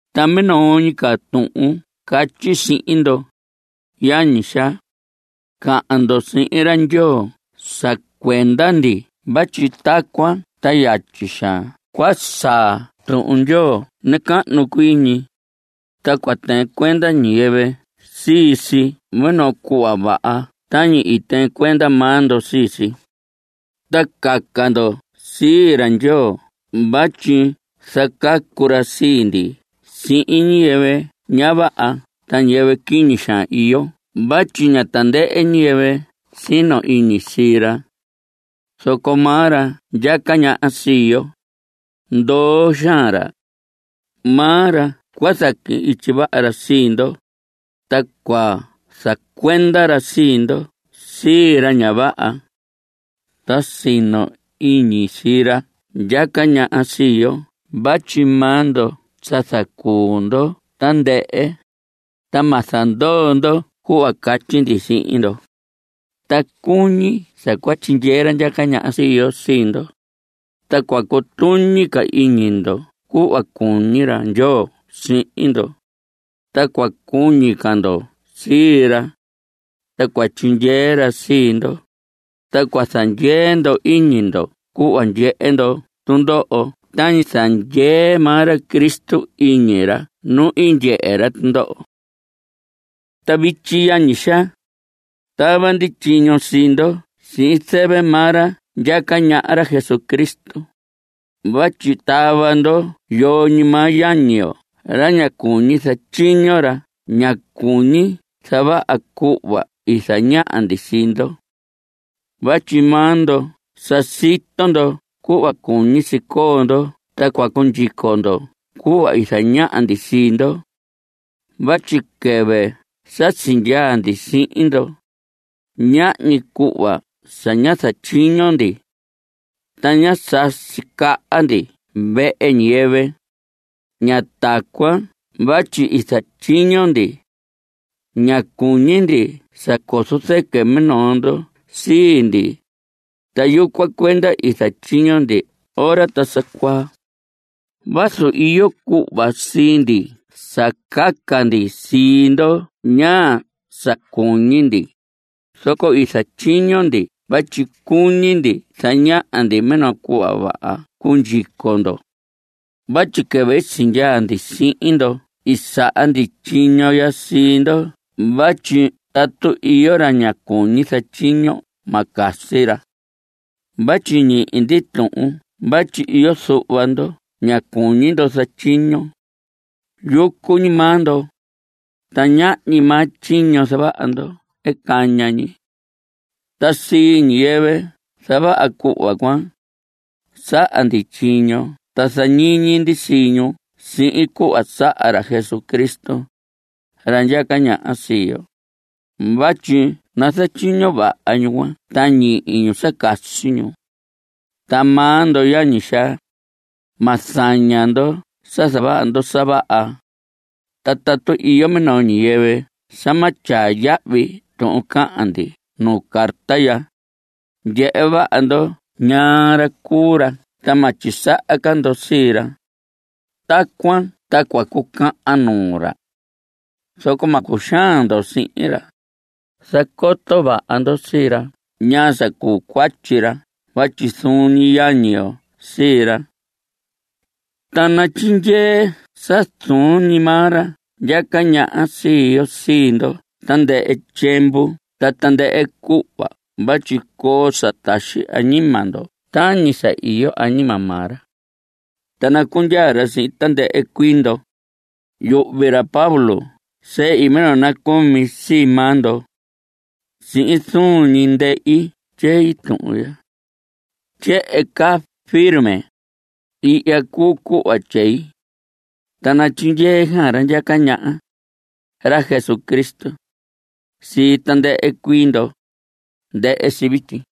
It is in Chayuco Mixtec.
Ta minoo ñi ca tuhun catyi sihin ndo, yañi xaa, cahan ndo sihin ra Ndyoo sa cuenda ndi vatyi tacuan ta yatyi xaan cua saa Tuhun Ndyoo nacahnu cuii ñi, ta cua tɨɨn cuenda ñiyɨvɨ sii si minoo cuhva vaha tañi i tɨɨn cuenda maa ndo sii si. Ta caca ndo sii ra Ndyoo vatyi zacacu ra sii ndi sihin ñiyɨvɨ ña vaha ta ñiyɨvɨ quiñi iyo vatyi ña tandɨhɨ ñiyɨvɨ sino iñi sii ra. Zoco maa ra ndyaca ñaha sii yo, ndoo xaan ra. Maa ra cua zaquihin ityi vaha ra sii ndo, ta cua zacuenda ra sii ndo sii ra ña vaha. Ta sino iñi sii ra ndyaca ñaha sii yo vatyi maa ndo sa zacuu ndo tandɨhɨ, ta ma zandoo ndo cuhva catyi ndi sihin ndo. Ta cuñi sa cua tyindyee ra ndyaca ñaha sii yo sii ndo, ta cua cutuñi ca iñi ndo cuhva cuñi ra Ndyoo sihin ndo, ta cua cuñi ca ndo sii ra. Ta cua tyindyee ra sii ndo, ta cua zandyee ndo iñi ndo cuhva ndyehe ndo tundoho tañi zandyee maa ra Cristo iñi ra nu i ndyehe ra tundoho. Ta vityi, yañi xaa, tava ndi tyiño sii ndo sihin zɨvɨ maa ra ndyaca ñaha, ra Jesucristo, vatyi tava ndo yoo ñi maa yañi yo ra ña cuñi zatyiño, ra ña cuñi zavaha cuhva i zañaha ndi sii ndo. Vatyi maa ndo sa sito ndo cuhva cuñi si coo ndo ta cua cundyico ndo cuhva i zañaha ndi sii ndo. Vatyi quɨvɨ sa sindyaa ndi sihin ndo, ñahñi cuhva sa ñá zatyiño ndi. Ta ñá sasi caha ñi ndi vehe ñiyɨvɨ. Ña tacuan vatyi i zatyiño ndi. Ña cuñi ndi sa cozo zɨquɨ numinoo ndo sii ndi, ta yucuan cuenda i zatyiño ndi ora ta sa cuaa. Vazu iyo cuhva sii ndi sa caca ndi sii ndo ñaa sa cuñi ndi, zoco i zatyiño ndi vatyi cuñi ndi zañaha ndi minoo cuhva vaha cundyico ndo. Vatyi quɨvɨ sindyaa ndi sihin ndo i saha ndi tyiño ya sii ndo vatyi tatu iyo ra ña cuñi zatyiño, ma casi ra. Vatyi ñihi ndi tuhun vatyi iyo zuhva ndo ña cuñi ndo zatyiño. Yucu ñi maa ndo, ta ñahñi maa tyiño zavaha ndo caña ñi. Ta sii ñiyɨvɨ zavaha cuhva cuan, saha ndi tyiño ta zañiñi ndi sii ñu sihin cuhva saha ra Jesucristo, ra ndyaca ñaha sii yo, vatyi nazatyiño vaha ñu cuan ta ñihi ñu sa casi ñu. Ta maa ndo, yañi xaa, ma zaña ndo sa zavaha ndo sa vaha. Ta tatu iyo minoo ñiyɨvɨ sa ma tyaa yahvi tuhun cahan ndi nu carta ya, ndyehe vaha ndo ñaa ra cuu ra ta ma tyisaha ca ndo sii ra. Tacuan ta cua cucahan nuu ra. Zoco ma cuxaan ndo sihin ra. Zacoto vaha ndo sii ra ñaa sa cuu cuatyi ra vatyi zuun ñi yañi yo sii ra. Ta natyindyee sa zuun ñi maa ra ndyaca ñaha sii yo sii ndo tandɨhɨ tyiemvu ta tandɨhɨ cuhva vatyi coo sa taxi añima ndo tañi sa iyo añima maa ra. Ta nacundyaa ra sihin tandɨhɨ cuii ndo. Yuhvi ra Pablo tyei minoo nacumi sii maa ndo. Sihin zuun ñi ndehi tyei tuhun ya. Tyehen caa firme. Ihya cuu cuhva tyei. Ta natyindyee xaan ra ndyaca ñaha, ra Jesucristo, sii tandɨhɨ cuii ndo. Ndɨhɨ si vityi.